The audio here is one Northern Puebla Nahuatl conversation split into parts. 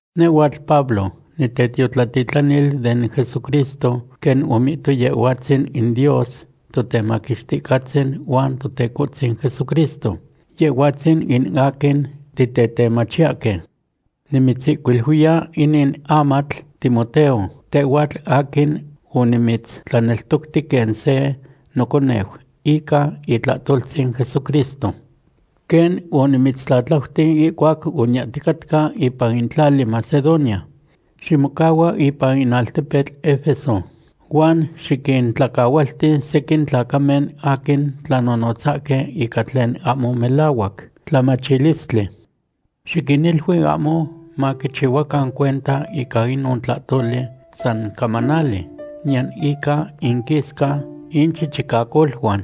Nehhuatl Pablo, nitetiotlatitlanil den Jesucristo quen omihto Yehhuatzin in Dios Totemaquixticahtzin huan Totecohtzin Jesucristo, Yehhuatzin in aquin titetemachiyahque. Nimitzihcuiluiya inin amatl Timoteo, tehhuatl aquin onimitztlaneltocti quen se noconeu ica itlahtoltzin Jesucristo. Quen onimitztlatlauti ihcuac oniyahticatca ipan in tlali Macedonia, ximocahua ipan in altepetl Efeso huan xiquintlacahualti sequin tlacamen aquin tlanonotzahque ica tlen ahmo melahuac tlamachilistli. Xiquinilui ahmo maquichihuacan cuenta ica inon tlahtoli san camanali, niyan ica inquisca inchichicacoluan.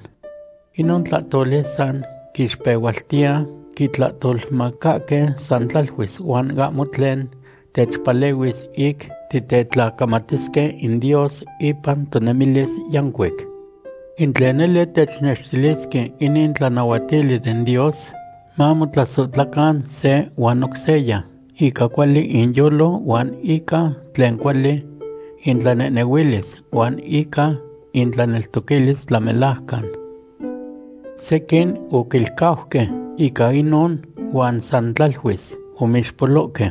Inon tlahtoli san quixpehualtiya quitlahtolmacahque san tlaluis huan ahmo tlen techpalehuis ic titetlacamatisque in Dios ipan tonemilis yancuic. In tlen nele technextilisque inin tlanahuatili den Dios, mamotlasohtlacan se huan oc seya ica cuali inyolo huan ica tlen cuali intlanehnehuilis huan ica intlaneltoquilis tlamelajcan. Sequin oquilcauque ica inon huan san tlaluis omixpolohque.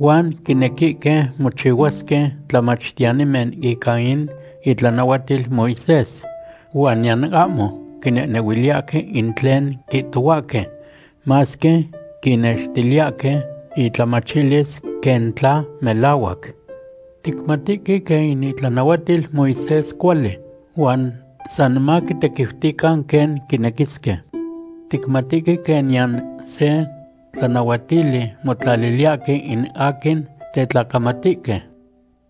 Huan quinequihque mochihuasque tlamachtiyanimen ica in itlanahuatil Moisés huan niyan ahmo quinehnehuiliyahque in tlen quihtohuahque masque quinnextiliyahque intlamachilis quen tla melahuac. Ticmatihque quen in itlanahuatil Moisés cuali, san maquitequiutican quen quinequisque. Ticmatihque quen niyan se tlanahuatili motlaliliyahque in aquin tetlacamatihque.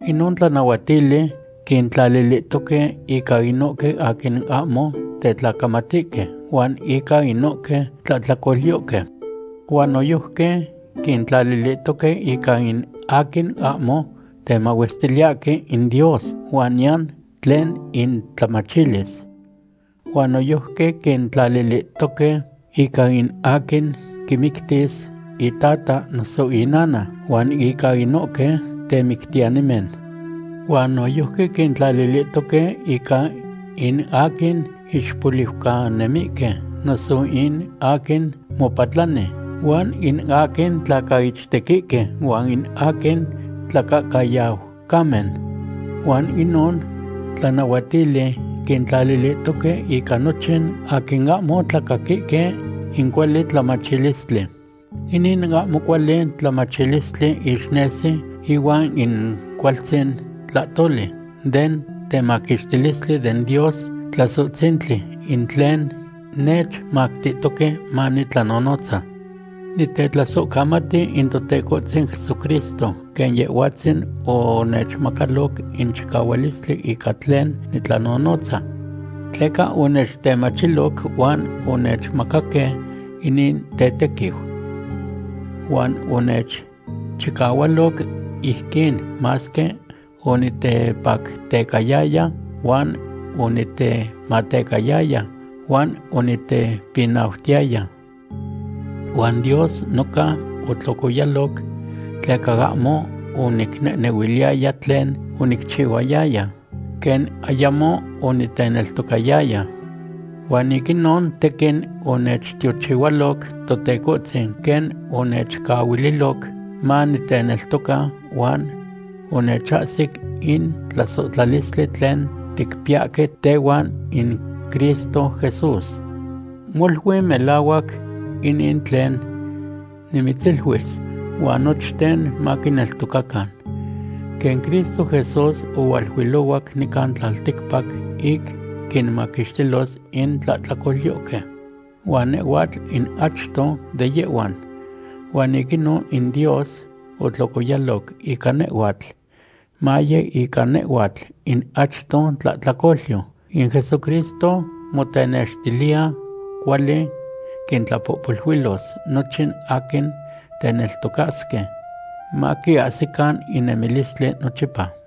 Inon tlanahuatili quintlalilihtoque ica inohque aquin ahmo tetlacamatihque huan ica inohque tlahtlacolyohque. Huan noyojqui quintlalilihtoque ica in aquin ahmo temahuestiliyahque in Dios huan niyan tlen intlamachilis. Huan noyojqui quintlalilihtoque ica in aquin quimictis itata noso inana huan ica inohque temictiyanimen. Huan noyojqui quintlalilihtoque ica in aquin ixpoliucanemihque noso in aquin mopatlani, huan in aquin tlacaichtequihque, huan in aquin tlacahcayaucamen. Huan inon tlanahuatili quintlalilihtoque ica nochin aquin ahmo tlacaquihque in cuali tlamachtilistli. Inin ahmo cuali tlamachtilistli ixnesi ihuan in cualtzin tlahtoli den temaquixtilistli den Dios Tlasohtzintli, in tlen nechmactihtoque manitlanonotza. Nitetlasohcamati in Totecohtzin Jesucristo, quen Yehhuatzin onechmacaloc in chicahualistli ica tlen nitlanonotza. Tleca onechtemachiloc huan onechmacaque inin tetequiu. Huan onechchihualoc ijquin masque onitepactecayaya huan onitematecayaya huan onitepinautiyaya. Huan Dios noca otlocoyaloc tleca ahmo onicnehnehuiliyaya tlen onicchihuayaya, quen ayamo oniteneltocayaya. Huan ic inon tequin onechtiochihualoc Totecohtzin quen onechcahuililoc maniteneltoca huan onechahsic in tlasohtlalistli tlen ticpiyahque tehuan in Cristo Jesús. Molui melahuac inin tlen nimitziluis huan nochten maquineltocacan. Quen Cristo Jesús ohualuilohuac nican tlalticpac ic quinmaquixtilos in tlahtlacolyohque, huan nehhuatl in achto de yehhuan. Huan ic inon in Dios otlocoyaloc ica nehhuatl, maye ica nehhuatl in achto tlahtlacolyo, in Jesucristo motenextiliya cuali quintlapohpoluilos nochin aquin teneltocasque, maquiahsican in nemilistli nochipa.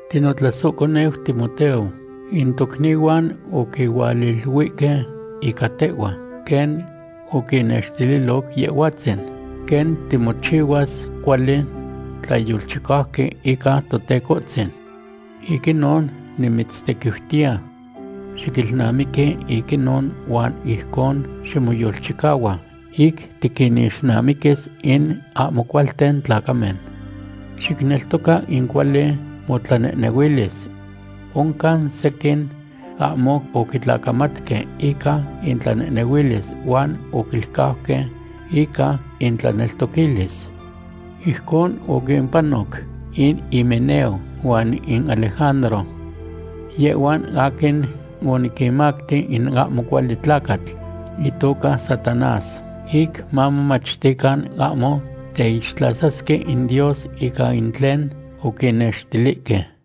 Tinotlasohconeu Timoteo, in tocnihuan oquihualiluihque ica tehhua quen oquinnextililoc Yehhuatzin, quen timochihuas cuali tlayolchicauqui ica Totecohtzin. Ic inon nimitztequiutiya xiquilnamiqui ic inon huan ijcon ximoyolchicahua ic tiquinixnamiquis in ahmo cualten tlacamen. Xicneltoca ica cuali motlanehnehuilis. Oncan sequin ahmo oquitlacamatque ica intlanehnehuilis huan oquilcauque ica intlaneltoquilis. Ijcon oquimpanoc in Himeneo huan in Alejandro. Yehhuan aquin oniquinmacti in ahmo cuali tlacatl itoca Satanás ic mamomachtican ahmo teixtlasasque in Dios ica in tlen oquinextilihque.